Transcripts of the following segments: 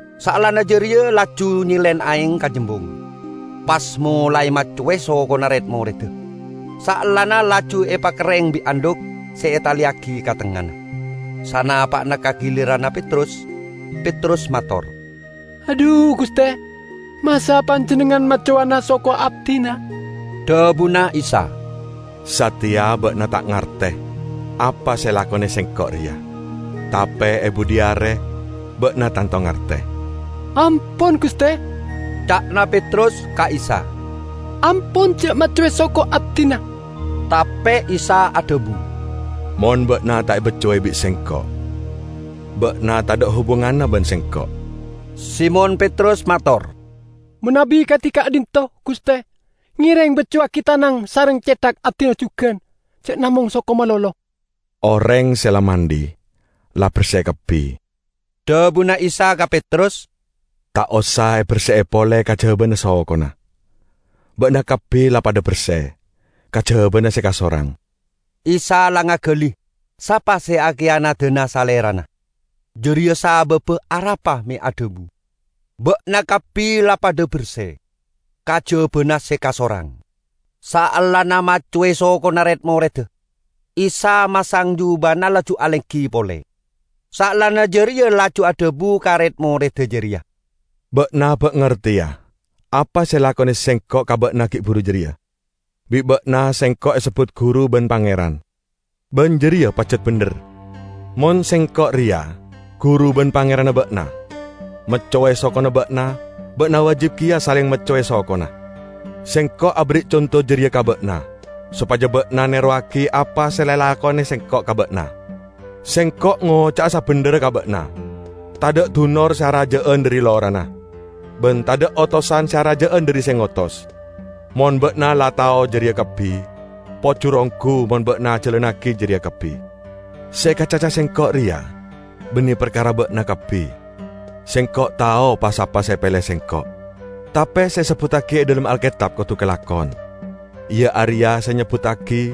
Saellana jareya laju nyelen aeng ka jembung, pas molae maccowe sokona red-moredda, saellana laju epakerreng bi' andhuk se etaleyagi ka tengngana. Sanapa'na ka giliranna Petrus, Petrus mator, "Adhu, Guste, masa' Panjennengngan maccowana soko abdina?" Dhabuna Isa, "Sateya ba'na ta' ngarte apa se elakone Sengko' reya, tape e budhi are ba'na tanto ngarte." "Ampon, Guste," ca'na Petrus ka Isa, "Ampon ja' maccowe soko abdina!" Tape Isa adhabu, "Mon ba'na ta' ebaccowe bi' Sengko', ba'na tadha' hubunganna ban Sengko'." Simon Petrus mator, "Manabi kadi ka'dhinto', Guste, ngereng baccowagi tanang sareng cethak abdina jugan, ja' namong soko malolo." "Oreng se la mandhi, la berse kabbi," dhabuna Isa ka Petrus. "Ta' osa eberse'e pole kajabana sokona. Ba'na kabbi la padha berse, kajabana se kasorang." ( Isa la ngagali sapa se akiyanadana Salerana. Jareya sababba arapa me' adhabu, "Ba'na kabbi la padha berse, kajabana se kasorang.") Saellana maccowe sokona red-moredda, Isa masang jubana laju alenggi pole. Saellana jareya laju adhabu ka red-moredda jareya, "Ba'na ba' ngarteya apa se elakone Sengko' ka ba'na gi' buru jareya? Bi' ba'na Sengko' esebbut Guru ban Pangeran. Ban jareya pajat bendher. Mon Sengko' reya, Guru ban Pangeranna ba'na, maccowe sokona ba'na, ba'na wajib keya saleng maccowe sokona. Sengko' aberri' conto jareya ka ba'na, sopaja ba'na nerowagi apa se la elakone Sengko' ka ba'na. Sengko' ngoca'a sabendherra ka ba'na: tadha' dunor se araja'an dhari lorana, ban tadha' otosan se araja'an dhari se ngotos. Mon ba'na la tao jareya kabbi, pojur onggu mon ba'na ajalannagi jareya kabbi. Se ekacaca Sengko' reya banne parkara ba'na kabbi. Sengko' tao pa-sapa se epele Sengko'. Tape se esebbuttagi e dhalem Alketab kodu kalakon, iya areya se nyebbuttagi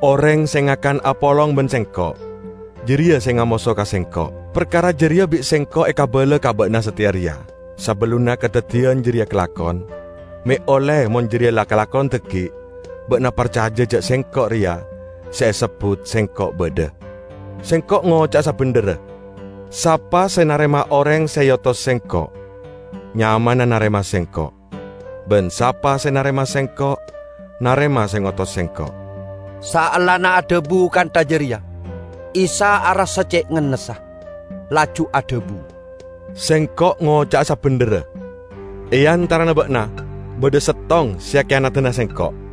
'Oreng se ngakan apolong ban Sengko', jareya se ngamoso ka Sengko'.' Parkara jareya bi' Sengko' ekabala ka ba'na sateya reya, sabellunna kadaddiyan jareya kalakon, me' olle mon jareya la kalakon dhaggi' ba'na parcaja ja' Sengko' reya se esebbut SENGKO' BADHA. Sengko' ngoca'a sabendherra: Sapa se narema oreng se eotos Sengko', nyamana narema Sengko'. Ban sapa se narema Sengko', narema se ngotos Sengko'." Saellana adhabu kantha jareya, Isa arassa ce' ngennessa. Laju adhabu, "Sengko' ngoca'a sabendherra: E antarana ba'na badha settong se akiyanadana Sengko'."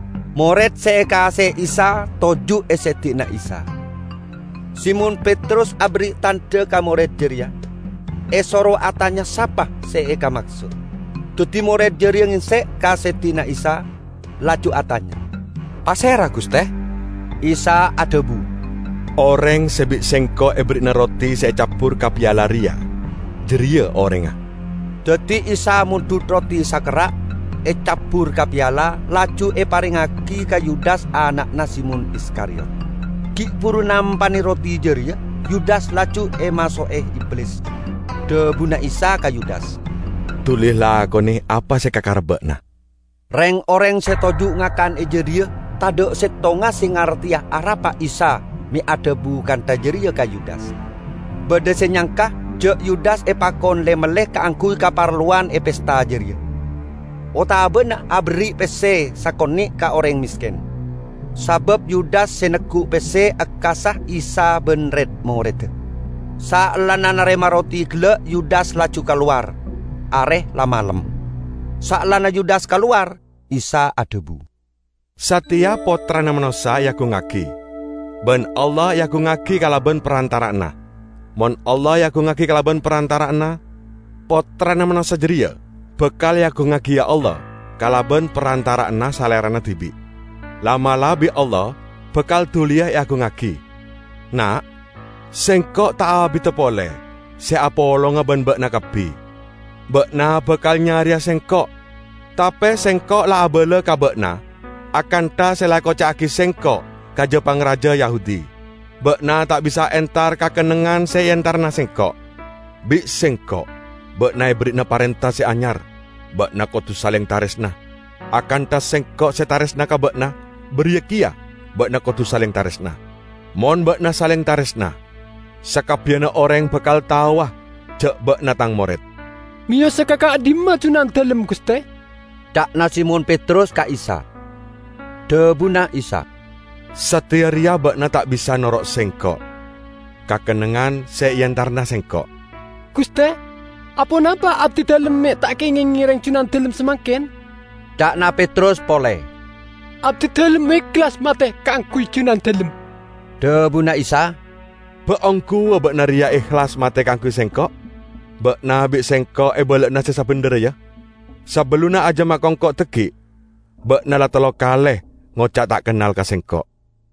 Mored se ekaase'e Isa toju' e seddi'na Isa. Simon Petrus aberri' tandha ka mored jareya, esoro atanya sapa se ekamaksod. Daddi mored jareya ngengsek ka seddi'na Isa, laju atanya, "Pasera, Guste?" Isa adhabu, "Oreng se bi' Sengko' eberri'ana roti se ecabbur ka piala reya, jareya orengnga." Daddi Isa mondhut roti sakerra', ecabbur ka piala, laju eparengngagi ka Yudas ana'na Simon Iskariyot. Gi' buru nampane roti jareya Yudas laju emaso'e Iblis. Dhabuna Isa ka Yudas, "Duli lakone apa se ekakarep ba'na." Reng-oreng se toju' ngakan e jadhiya tadha' settonga se ngarteya arapa Isa me' adhabu kantha jareya ka Yudas. Badha se nyangka ja' Yudas epakon le-melle kaangguy kaparlowan e pesta jareya, otabana aberri' pesse sakone' ka oreng mesken, sabab Yudas se neggu' pesse ekkassa Isa ban red-moredda. Saellana narema roti gella' Yudas laju kalowar. Are la malem. Saellana Yudas kalowar, Isa adhabu, "Sateya Pottrana Manossa eagungngagi, ban Allah eagungngagi kalaban parantara'anna. Mon Allah eagungngagi kalaban parantara'anna, Pottrana Manossa jareya bakal eagungngagiya Allah kalaban parantara'anna Salerana dibi'. La'-mala' bi' Allah bakal duliya eagungngagi. Na', Sengko' ta' abida pole se apolonga ban ba'na kabbi. Ba'na bakal nyareya Sengko', tape Sengko' la abala ka ba'na akantha se la ekoca'agi Sengko' ka ja-pangraja Yahudi. Ba'na ta' bisa entar ka kennengngan se eentarana Sengko'. Bi' Sengko' ba'na eberri'ana parenta se anyar: Ba'na kodu saleng taresna. Akantha Sengko' se taresna ka ba'na, bariya keya ba'na kodu saleng taresna. Mon ba'na saleng taresna, sakabbiyanna oreng bakal taowa ja' ba'na Tang mored." "Meyosa ka ka'dhimma Junandalem, Guste?" ca'na Simon Petrus ka Isa. Dhabuna Isa, "Sateya reya ba'na ta' bisa noro' Sengko' ka kennengngan se eentarana Sengko'." "Guste, aponapa abdidalem me' ta' kengeng ngereng Junandalem samangken?" ca'na Petrus pole. "Abdidalem ehlas mate kaangguy Junandalem!" Dhabuna Isa, "Ba' ongguwa ba'na reya ehlas mate kaangguy Sengko'? Ba'na bi' Sengko' ebala'ana se sabendherra, ya: sabellunna ajam akongko' dhaggi', ba'na la tello kale ngoca' ta' kennal ka Sengko'!"